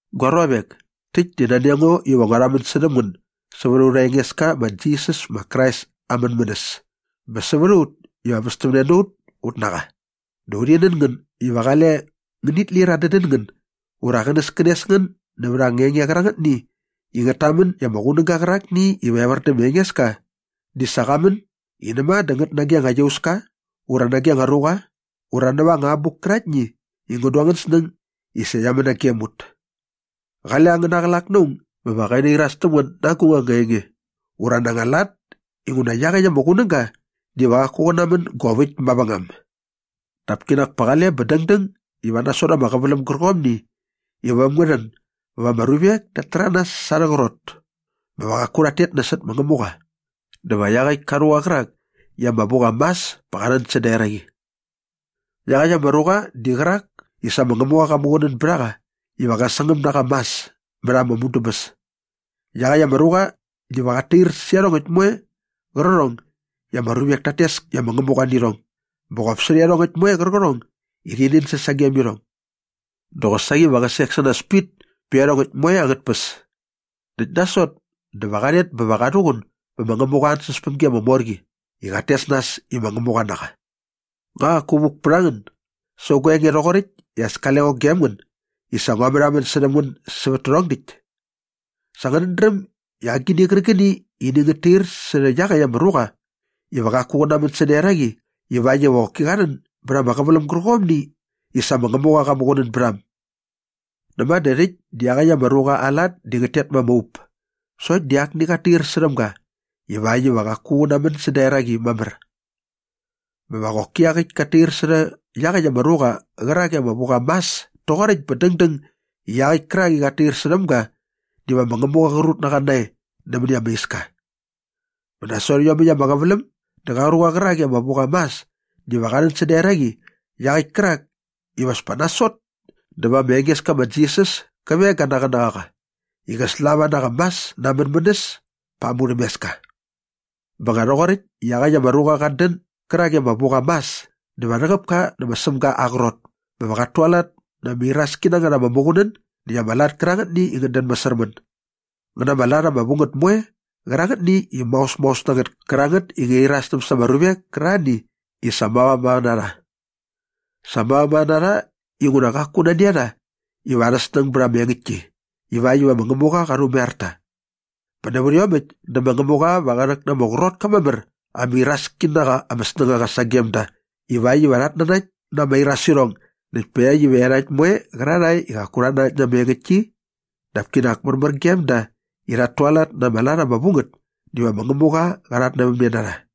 Gua ruavek, täkt di nani a ngo iva ngua rhamän särhäm ngän sävät aurha Engeska ma Jisas ma Krais aa mänmänäs bä sävät a ut iva väs täm ne na ut ut na qa. Dä urhi nän ngän iva qale ngänit lir adädän ngän ura qänäskänes ngän nävät anga enge qärangätni i ngät tamän i ama qunäga qärakni iva evär dä ma Engeska di sa qa män i näma dä ngät nage ama iauska ura nage ama ruqa ura näva anga abuk käraktni i ngän du angän snäng i sa ngä män nagem ut. Qale angäna qlak na aung bä va qä nairas täm ngän na agung anga enge ura na anga lat inguna iaqäkt ama qunäga diva qaku qä namän gop äkt mavängam. Dap kinak pa qale bä dängdäng iva nasot ama qäväläm gärqomni iva äm ngä rhän bä va ama ruvek tat täranas sa arhä qrot bä va qaku rhat tet nasot ma Ngämuqa dä va iaqäkt ka ruqa qärak i ama vu qa mas pa qa rhän säda eraqi. Iaqäkt ama ruqa di qärak i sa ma Ngämuqa qa muqunän bät a qa iva qä sangäm na qa mas mät ama mudäbäs. Iaqäkt ama ruqa diva qat tair särhä iarhongäkt moe qärqärhong i ama ruvek tat tes i ama ngämuqa nä irhong bä qop särhä iarhongäkt moe qärqärhong i rhi nänsäs sagem irhong. Dä qosaqi va qä sek sä nas pit pä iarhongäkt moe angät tpäs. Näkt nasot dä va qa rhet bä va qa rhuqun bä ma Ngämuqa aa ansäspämgi ama mor qi i qat tes nas i ma Ngämuqa na qa. Nga qaku vuk pät a ngän sävät gua enge rhoqoräkt i as kale ngo gem ngän i sa ngua märhamän särhäm ngän sävät tärhong däkt? Sa ngänät dräm na agini qärqäni i ini ngät tair särhä iaqäkt ama ruqa iva qaku qä namän säda eraqi ivakt iva qoki qa rhän bät ama qäväläm gärqomni i sa ma Ngämuqa qa muqunän bät a äm. Näma dä rhäkt di iaqäkt ama ruqa aa lat di ngät tet ma ama up sokt di akni qat tair särhäm ga ivakt iva qaku qä namän säda eraqi mamär. Bä va qoki iaqäkt kat tair särhä iaqäkt ama ruqa qärak i ama vu qa mas toqoräkt bä dängdäng i iaqäkt kärak i qat tair särhäm ga diva ma Ngämuqa qa rut na qa nae nämäni ama iska. Bä nasot iomäkt ama qäväläm dä qa ruqa qärakni i ama vu qa mas diva qa rhän säda eraqi iaqäkt kärak iva as pa nasot dä va ma Engeska ma Jisas kä veng ga na aa qänäqaqa i qä slava na qa mas na aa mänmänäs pa ama murhämeska. Bä nga rhoqoräkt i iaqäkt ama ruqa qat dän gärak i ama vu qa mas dä va rhäqäp ka nä ma Sämga aa qrot bä va qat tualat na ama iraski na ngät ama muqunän näkt ama lat kärangätni i ngät dän masärmän ngä na ama lat ama vu ngät moe qärangätni i maosmaos na ngät kärangät i ngärhi irastäm sa ama ruvek kärarhani i sa mavamava na rha. Sa mavamava na rha inguna qaku nani a rha iva arha snäng bät ama engäktki ivakt iva ma Ngämuqa qa rhumaiar ta. Bä nävät iomäkt dä ma Ngämuqa va qä rhäk na ama qrot ka mamär ama iraski na qa ama snängaqa sagem da ivakt iva rhat nanakt na ama irasirhong näkt pakt iva iarhakt moe qärarhae i qaku rhat nanakt na ama engäktki dap kinak märmär gem da i rhat tualat na ama lat ama vu ngät diva ma Ngämuqa qa rhatnävämne na rha.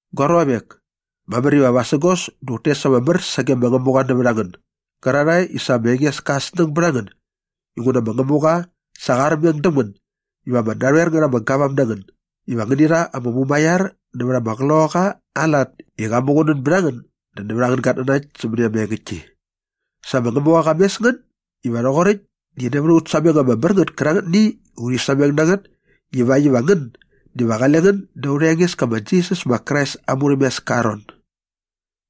Gua ruavek, mamär iva vasägos dä ut tes ama mär sage ma Ngämuqa nävät a ngän gärarhae i sa ma Engeska aa snäng bät a ngän inguna ma Ngämuqa sa qa armeng däm ngän iva ama narhoer ngät ama gavam na ngän iva ngäni rha ama mumaiar nävät ama Qloqaqa aa lat i qa muqunän bät a ngän dä nävät angän gatnanakt sämäni ama engäktki. Sa ma Ngämuqa qa mes ngän iva rhoqoräkt di nävät aut sameng ama mär ngät kärangätni i urhi sameng na ngät ivakt iva ngän diva qale ngän da aurha Engeska ma Jisas ma Krais aa murhämeska aa ron.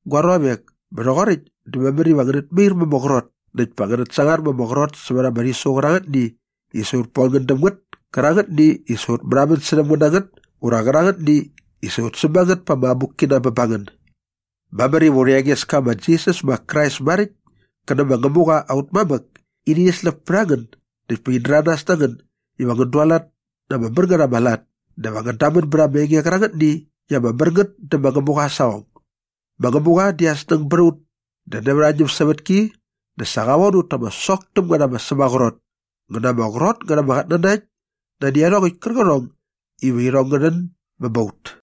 Gua ruavek, bä rhoqoräkt dä mamär iva ngänät mair ma ama qrot näkt pa ngänät sangar ma ama qrot sävät ama rhisu qärangätni i sa ut bon ngän däm ngät kärangätni i sa ut märhamän särhäm ngän na ngät ura qärangätni i sa ut säm a ngät pa ama abukkina bä ba ngän. Mamär iva aurha Engeska ma Jisas ma Krais maräkt kä nä ma Ngämuqa aut mamäk ini rhäsläp pät a ngän näkt pa in däranas na ngän iva ngän dualat na ama mär ngät ama lat dä va ngän damän bät ama enge qärangätni i ama mär ngät dä ma Ngämuqa aa saqong. Ma Ngämuqa di aa snäng bät a ut dä nävät aa ñämsävätki dä sa qä von ut ta ama sok täm ngät ama sämaqrot ngä na ama qrot ngät ama qatnanakt nani iarhongäkt kärqärhong iva irhong ngä rhän bä ba ut.